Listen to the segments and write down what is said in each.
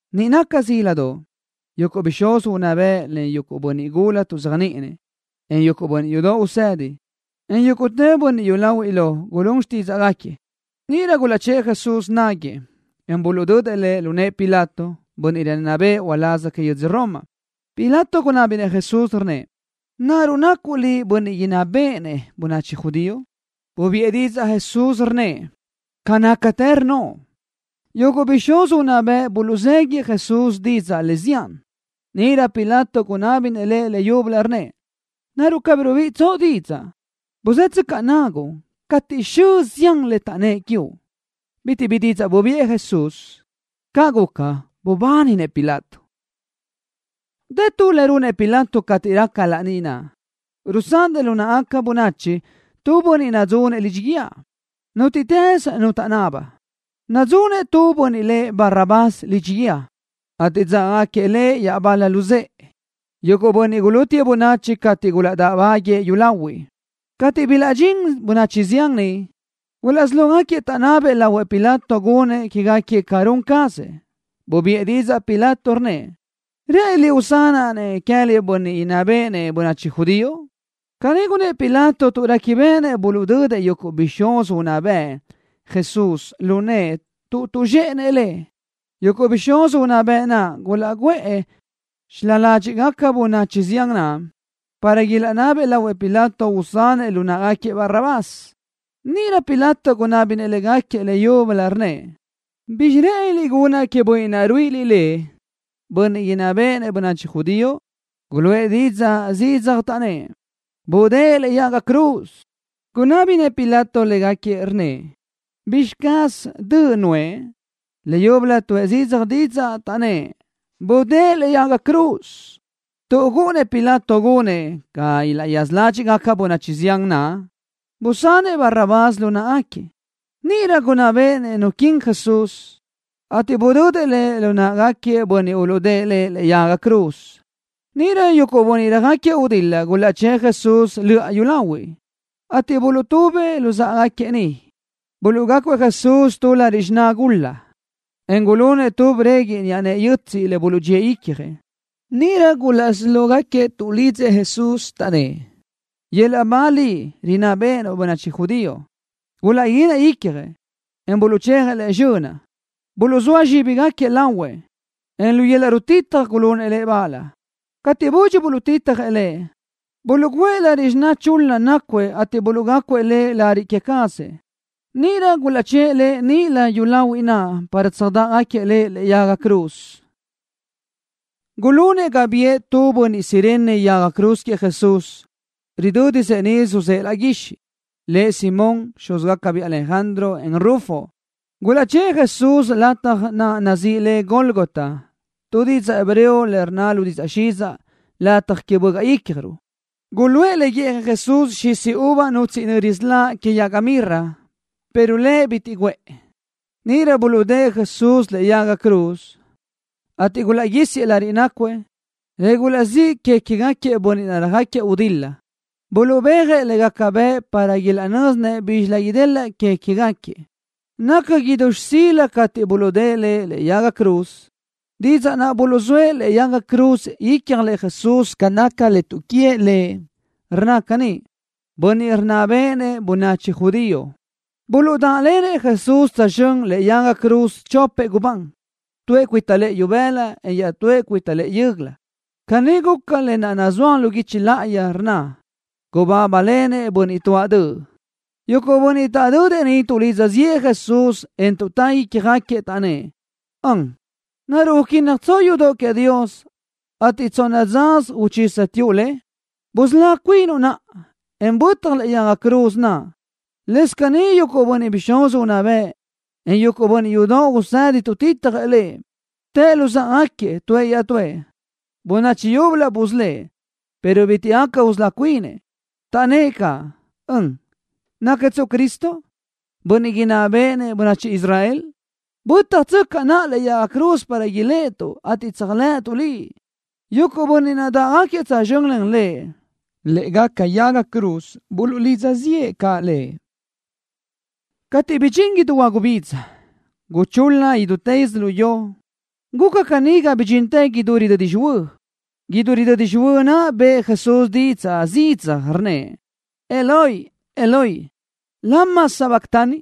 Niʼ naca zíladoʼ, yuguʼ bixúz unná bëʼ len bönniʼ gula tuʼzéajniʼinëʼ, en yuguʼ bönniʼ yudoʼ usedi, en yúguʼtë bönniʼ yúlahuiʼ lo gulún xtídzaʼgaquiëʼ. Níʼirö gulaʼchë́ʼë Jesús náguëʼë, en buluʼdödëʼ Lëʼ lu nëʼë Pilato, bönniʼ rinná bëʼë uláz que yödz Roma. Pilato gunábinëʼ Jesús, rnnëʼ: —¿Naruʼ nacuʼ Liʼ Bönniʼ inná béʼenëʼ bönachi judío? Bubiʼë didzaʼ Jesús, rnnëʼ: —Ca nácatë rnnoʼ. Yuguʼ bixúz unná bëʼ buluʼzéguiëʼ Jesús didzaʼ le zián. Níʼirö Pilato gunábinëʼ Lëʼ leyúbölö, rnnëʼ: —¿Naruʼ cabí rubiʼitsoʼ didzaʼ? Buzë́tsöcaʼ naguʼ cateʼ xö zián le taʼnnë́ʼ quiuʼ. Bitiʼ bi didzaʼ bubiʼë Jesús. Caʼ guca, bubáninëʼ Pilato. Dë tu le runëʼ Pilato cateʼ raca laní naʼ, rusanëʼ lu náʼagaca bönachi tu bönniʼ nadzunëʼ lidxi guíë, nútiʼtës nu taʼnaba. Nadzunëʼ tu bönniʼ lëʼ Barrabás lidxi guíë, ateʼ dzágagaquiëʼ lëʼ iaʼbal-lëʼ luzë́ʼë, yuguʼ bönniʼ gulútiëʼ bönachi cateʼ gulaʼdáʼbáguiëʼ yúlahuiʼ. Cateʼ bilaʼdxín bönachi zián niʼ, gulaʼsí lógaquiëʼ taʼnabëʼ lahuëʼ Pilato gunëʼ quégaquiëʼ ca run cazëʼ. Bubiʼë didzaʼ Pilato, rnnëʼ: —¿Rë́ʼëniliʼ usanaʼ-nëʼ queë́liʼ Bönniʼ Inná Béʼenëʼ Bönachi Judío? Caní gunnë́ʼ Pilato tuʼ réquibeʼenëʼ buluʼdödëʼ yuguʼ bixúz unná bëʼ Jesús lu nëʼë tuʼ tuʼzxéʼenëʼ Lëʼ. Yuguʼ bixúz unná bëʼ naʼ gulaʼguʼë xilá ládxiʼgaca bönachi zián naʼ, para ilaʼnabëʼ lahuëʼ Pilato usanëʼ lu náʼagaquiëʼ Barrabás. Níʼirö Pilato gunábinëʼ légaquiëʼ leyúbölö, rnnëʼ: —¿Bizxi rë́ʼëniliʼ gunaʼ queëʼ bönniʼ naʼ ruíʼiliʼ lëʼ, Bönniʼ Inná Béʼenëʼ Bönachi Judío? Guluʼë zidzaj didzaʼ, taʼnnë́ʼ: —¡Budë́ʼë lëʼe yaga cruz! Gunábinëʼ Pilato légaquiëʼ, rnnëʼ: —¿Bizxi caz döʼ nuʼë? Leyúbölö tuʼë zidzaj didzaʼ, taʼnnë́ʼ: —¡Budë́ʼë lëʼe yaga cruz! Tuʼ gúʼunnëʼ Pilato gunëʼ ga ilaʼyaza ládxiʼgaca bönachi zián naʼ, busanëʼ Barrabás lu náʼagaquiëʼ. Níʼirö gunná béʼenëʼ nu quin Jesús, ateʼ budödëʼ Lëʼ lu náʼagaquiëʼ bönniʼ uluʼdë́ʼë Lëʼ lëʼe yaga cruz. Níʼirö yuguʼ bönniʼ röjáquiëʼ gudil-la gulaʼchë́ʼë Jesús löʼa yúlahuiʼ, ateʼ buluʼtubëʼ luzáʼagaquiëʼ niʼ. Buluʼgácuëʼ Jesús tu lariʼ xiná gul-la, en gulunëʼ tu breguiʼ niʼa nëʼe yötsiʼ, le buluʼdxíëʼ icjëʼ. Níʼirö gulaʼsí lógaquiëʼ tuʼlidzëʼ Jesús, taʼnnë́ʼ: —¡Yöl-laʼ ba liʼ, rinná béʼenuʼ bönachi judío! Gulaʼguínëʼ gui icjëʼ, en buluʼchejëʼ Lëʼ zxönaʼ. Buluʼzóa zxíbigaquiëʼ lahuëʼ, en lu yöl-laʼ rutitaj gulunëʼ Lëʼ bal. Cateʼ budxi buluʼtitjëʼ Lëʼ, buluʼgǘëʼ lariʼ xiná chul-la naʼ nácuëʼ ateʼ buluʼgácuëʼ Lëʼ lariʼ que cazëʼ. Níʼirö gulaʼchë́ʼë Lëʼ níʼilö yúlahuiʼ naʼ para tsöjdaʼgaquiëʼ Lëʼ lëʼe yaga cruz. Gulunëʼ ga biʼë tu bönniʼ Cirene yaga cruz queëʼ Jesús, ridö́disëʼ niʼ suzë́ʼë laʼ guixiʼ. Lëʼ Simón, xúzgacabiʼ Alejandro, en Rufo. Gulaʼchë́ʼë Jesús lataj naʼ nazíʼi le Gólgota, tu didzaʼ hebreo le rnna lu didzaʼ xidzaʼ, Lataj Que Bögaʼ Ícjaruʼ. Guluʼë le guíʼjëʼ Jesús xisi uva nutsiʼ nöri siláʼ que yaga mirra, pero Lëʼ bitiʼ guʼë le. Níʼirö buluʼdë́ʼë Jesús lëʼe yaga cruz, ateʼ gulaʼguísiëʼ lariʼ nácuëʼ, le gulaʼzíʼ que queë́gaquiëʼ bönniʼ naʼ röjáquiëʼ gudil-la. Buluʼbéajëʼ le gaca bëʼ para ilaʼnö́zinëʼ bízxilö idelaʼ que queë́gaquiëʼ. Naca idú xsila cateʼ buluʼdë́ʼë Lëʼ lëʼe yaga cruz. Didzaʼ naʼ buluʼzóëʼ lëʼe yaga cruz ícjalëʼ Jesús ca naca le tuʼquíëʼ Lëʼ rnna caní: “Bönniʼ Rinná Béʼenëʼ Bönachi Judío.” Buluʼdáʼlenëʼ Jesús tsözxö́n lë́ʼegaca yaga cruz chopëʼ gubán, tuëʼ cuita lëʼë ibëla, en iaʼtúëʼ cuita lëʼë yö́göla. Caní guca lë naʼ nazúaj lu guichi láʼayi, rnna: Gubábalenëʼ bönniʼ tuáʼ döʼ. Yuguʼ bönniʼ taʼdödëʼ niʼ tuʼlidza ziʼë Jesús, en tuʼtá ícjagaquiëʼ, taʼnnë́ʼ: —¡Ön! ¿Naruʼ uquínnajtsoʼ yudoʼ queëʼ Dios, ateʼ tsonna dzasö uchísatsuʼ le? ¡Busölá cuinuʼ naʼa, en bötaj lëʼe yaga cruz naʼ! Lëscaʼ caní yuguʼ bixúz unná bëʼ, en yuguʼ bönniʼ yudoʼ usedi tuʼtitjëʼ Lëʼ. Tëʼ luzáʼagaquiëʼ tuëʼ iaʼtúëʼ: —Bönachi yúbölö busölë́ʼ, pero bitiʼ gaca usölá cuinëʼ. Taʼnnë́ʼ caʼ: —¡Ön! ¿Nácatsuʼ Cristo, Bönniʼ Inná Béʼenëʼ Bönachi Israel? ¡Bö́tjatsöcaʼ naʼa lëʼe yaga cruz para iléʼetuʼ, ateʼ tséajlëʼëtuʼ Liʼ! Yuguʼ bönniʼ naʼ dáʼgaquiëʼ tsözxö́n len Lëʼ lë́ʼegaca yaga cruz buluʼlidza ziʼë caʼ Lëʼ. Cateʼ bidxín idú huagubidza, guchul-la idútë yödzölió. Guca caní ga bidxintë idú ridödi xihuö́. Idú ridödi xihuö́ naʼ bëʼë Jesús zidzaj didzaʼ, rnnëʼ: —Eloi, Eloi, ¿lama sabactani?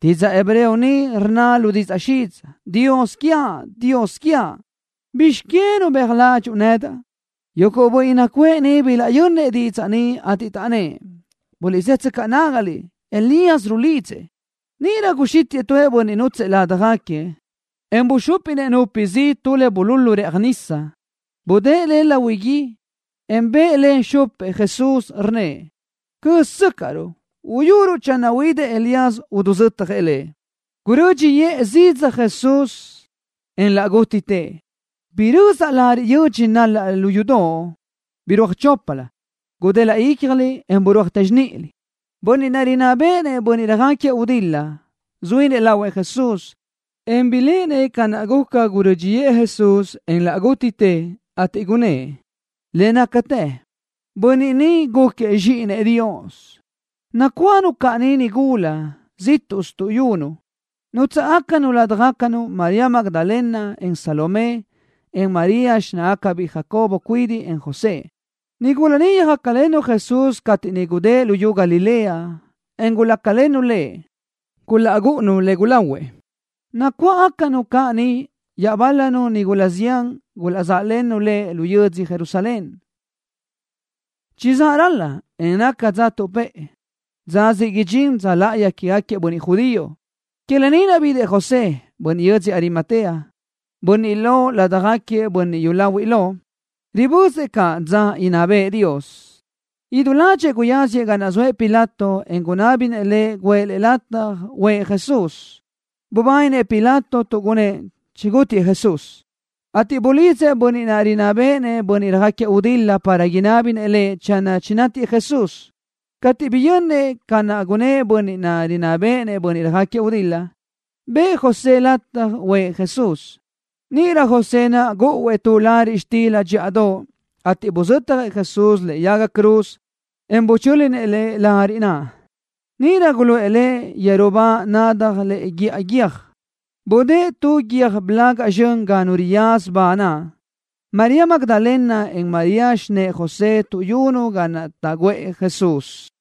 Didzaʼ hebreo ni rnna lu didzaʼ xidzaʼ: Dios quiaʼ, Dios quiaʼ, ¿bizx que nubéaj ládxuʼu nedaʼ? Yuguʼ bönniʼ nacuʼë niʼ bilaʼyönnëʼ didzaʼ ni, ateʼ taʼnnë́ʼ: —Buliʼzë́tsöcaʼ nágaliʼ. Elías rulidzëʼ. Níʼirö guxítiʼë tu bönniʼ nútsëʼë ládjagaquiëʼ, en buxúpinëʼ nupi zi tu le bululu rëʼaj nisa. Budë́ʼë le lahui gui, en bëʼë le xupëʼ Jesús, rnnëʼ: —Cö́ztsöcaʼruʼ, uyuruʼ channö huidëʼ Elías uzötjëʼ Lëʼ. Gurö́dxiʼë zidzaj Jesús, en laʼ gútitëʼ. Birözaʼ lariʼ yödx nalaʼ lu yudoʼ. Birúaj choplö, gudelaʼ icjlö, en birúajtë zxánilö. Bönniʼ naʼ rinná béʼenëʼ bönniʼ röjáquiëʼ gudil-la zuínëʼ lahuëʼ Jesús, en biléʼenëʼ ca naʼ guca gurö́dxiʼë Jesús, en laʼ gútitëʼ, ateʼ gunnë́ʼ: —Le nácatë bönniʼ ni gúquiëʼ Zxíʼinëʼ Dios. Nacuáʼanu caʼ niʼ nigula, zíʼtuʼsö tuʼyunu. Nútsaʼgacanu ládjagacanu María Magdalena, en Salomé, en María, xináʼagacabiʼ Jacobo cuidiʼ, en José. Nigula ni yöjácalennu Jesús cateʼ niʼ gudë́ʼ luyú Galilea, en gulácalennu Lëʼ, gulaʼgúʼunu le gulahuëʼ. Nacuáʼanu caʼ niʼ iaʼbál-lanu nigula zián gulaʼzáʼlennu Lëʼ lu yödzö Jerusalén. Chizáʼ ral-la, en naca dza tuʼpë́ʼë, dza siʼ idxín dza láʼayi quégaquiëʼ bönniʼ judío. Que lë ni naʼ bidëʼ José, bönniʼ yödzö Arimatea, bönniʼ lo ládjagaquiëʼ bönniʼ yúlahuiʼ lo. Ribözëʼ caʼ dza idinná bëʼë Dios. Idú ládxëʼë guyáziëʼ ga naʼ zoëʼ Pilato, en gunábinëʼ lëʼ guʼë lëʼ lataj uʼë Jesús. Bubáninëʼ Pilato tuʼ gunnë́ʼ chigútiëʼ Jesús, ateʼ bulidzëʼ bönniʼ naʼ rinná béʼenëʼ bönniʼ röjáquiëʼ gudil-la para inábinëʼ lëʼ channö chinátiëʼ Jesús. Cateʼ biyönnëʼ ca naʼ gunnë́ʼ bönniʼ naʼ rinná béʼenëʼ bönniʼ röjáquiëʼ gudil-la, bëʼë José lataj uʼë Jesús. Níʼirö José naʼ gúʼuëʼ tu lariʼ xtila dxíʼadoʼ, ateʼ buzötjëʼ Jesús lëʼe yaga cruz, en buchö́linëʼ Lëʼ lariʼ naʼ. Níʼirö guluʼë Lëʼ yeru ba nadaj lëʼe guíʼa guiö́j. Budë́ʼë tu guiö́j blaga zxön ga nu riyaza ba naʼ. María Magdalena, en María, xinë́ʼë José tuʼyunu ga naʼ taʼguʼë Jesús.